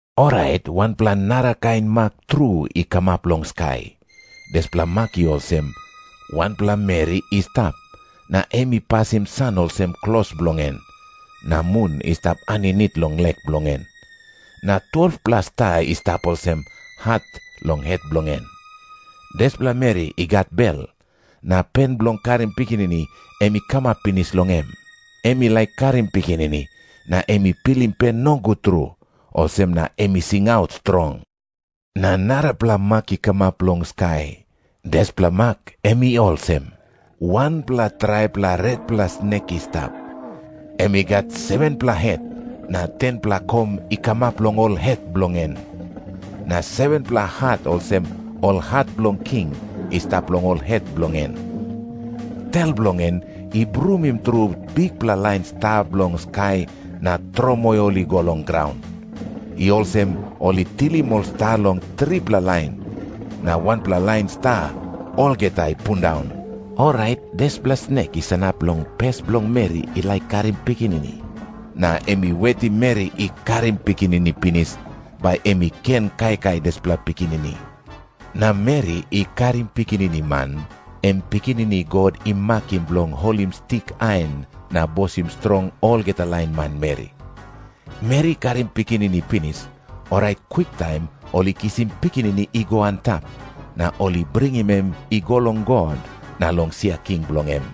Orait wanpela narakain mak tru i kamap long skai. Dispela mak i olsem. Wanpela meri i stap, na em i pasim san olsem klos bilong en. Na mun i stap aninit long lek bilong en, na 12-pela sta i stap olsem hat long het bilong en. Dispela meri i gat bel, na pen bilong karim pikinini em i kamap pinis long em. Em i laik karim pikinini, na em i pilim pen nogut tru, olsem na em i singaut strong. Na narapela mak i kamap long skai. Dispela mak em i olsem. Wanpela traipela retpela snek i stap. Em i gat 7-pela het, na 10-pela kom i kamap long ol het bilong en. Na 7-pela hat olsem ol hat bilong king i stap long ol het bilong en. Tel bilong en i brumim tru bikpela lain sta bilong skai na tromoi ol i go long graun. I olsem ol i tilim ol sta long tripela lain, na wanpela lain sta olgeta i pundaun. Orait dispela snek i sanap long pes bilong meri i laik karim pikinini, na em i wetim meri i karim pikinini pinis, bai em i ken kaikai dispela pikinini. Na meri i karim pikinini man, em pikinini God i makim bilong holim stik ain na bosim strong olgeta lain manmeri. Meri i karim pikinini pinis, orait kwiktaim ol i kisim pikinini i go antap, na ol i bringim em i go long God na long sia king bilong em.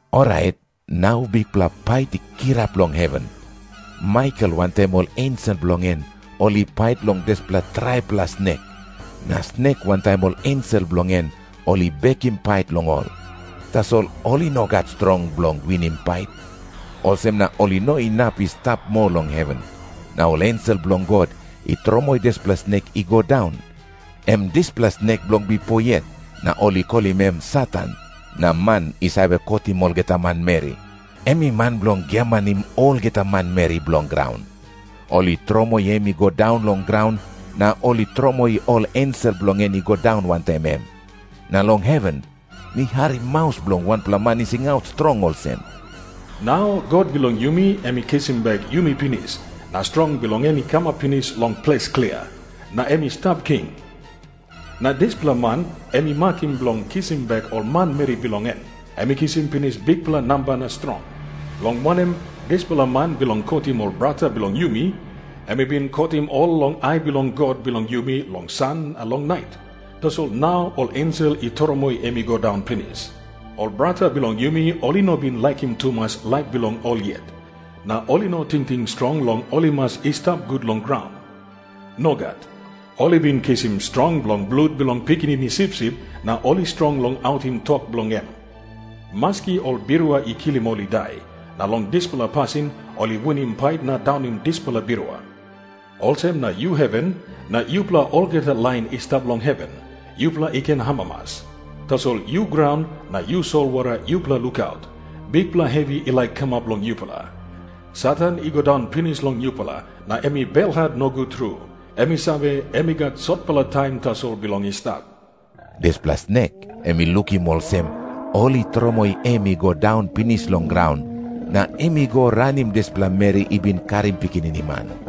Orait nau bikpela pait i kirap long heven. Maikel wantaim ol ensel bilong en ol i pait long dispela traipela snek. Na snek wantaim ol ensel bilong en ol i bekim pait long ol, tasol ol i no gat strong bilong winim pait. Olsem na ol i no inap i stap moa long heven, na ol ensel bilong God i tromoi dispela snek i go daun. Em dispela snek bilong bipo yet, na ol i kolim em Satan na “Man I Save Kotim Olgeta Manmeri.” Em i man bilong giamanim olgeta manmeri bilong graun. Ol i tromoi em i go daun long graun, na ol i tromoi ol ensel bilong en i go daun wantaim em. Na long heven mi harim maus bilong wanpela man i singaut strong olsem, “Nau God bilong yumi em i kisim bek yumi pinis, na strong bilong en i kamap pinis long ples klia, na em i stap king. Na dispela man em i makim bilong kisim bek ol manmeri bilong en, em i kisim pinis bikpela namba na strong. Long wanem, dispela man bilong kotim ol brata bilong yumi, em i bin kotim ol long ai bilong God bilong yumi long san na long nait, tasol nau ol ensel i tromoi em i go daun pinis. Ol brata bilong yumi ol i no bin laikim tumas laip bilong ol yet, na ol i no tingting strong long ol i mas i stap gut long graun. Nogat. Ol i bin kisim strong long blut bilong Pikinini Sipsip na ol i strong long autim tok bilong em, maski ol birua i kilim ol i dai. Na long dispela pasin ol i winim pait na daunim dispela birua. Olsem na yu heven, na yupela olgeta lain i stap long heven, yupela i ken amamas. Tasol yu graun, na yu solwara, yupela lukaut. Bikpela hevi i laik kamap long yupela. Satan i go daun pinis long yupela, na em i belhat nogut tru. Em i save, em i gat sotpela taim tasol bilong i stap.” Dispela snek em i lukim olsem ol i tromoi em i go daun pinis long graun, na em i go ranim dispela meri i bin karim pikinini man.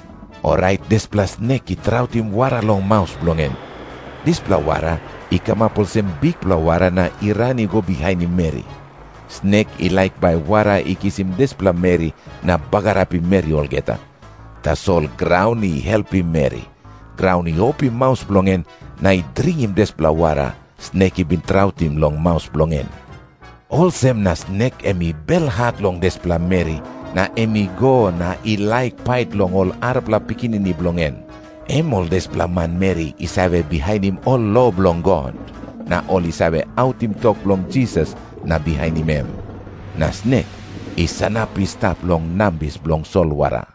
Orait dispela snek i trautim wara long maus bilong en. Dispela wara i kamap olsem bikpela wara na i ran i go bihainim meri. Snek i laik bai wara i kisim dispela meri na bagarapim meri olgeta. Tasol graun i helpim meri. Graun i opim maus bilong en na i dringim dispela wara, snek i bin trautim long maus bilong en. Olsem na snek em i belhat long dispela meri, na em i go na i laik pait long ol arapela pikinini bilong en, em ol dispela manmeri i save bihainim ol lo bilong God, na ol i save autim tok bilong Jisas na bihainim em. Na snek i sanap i stap long nambis bilong solwara.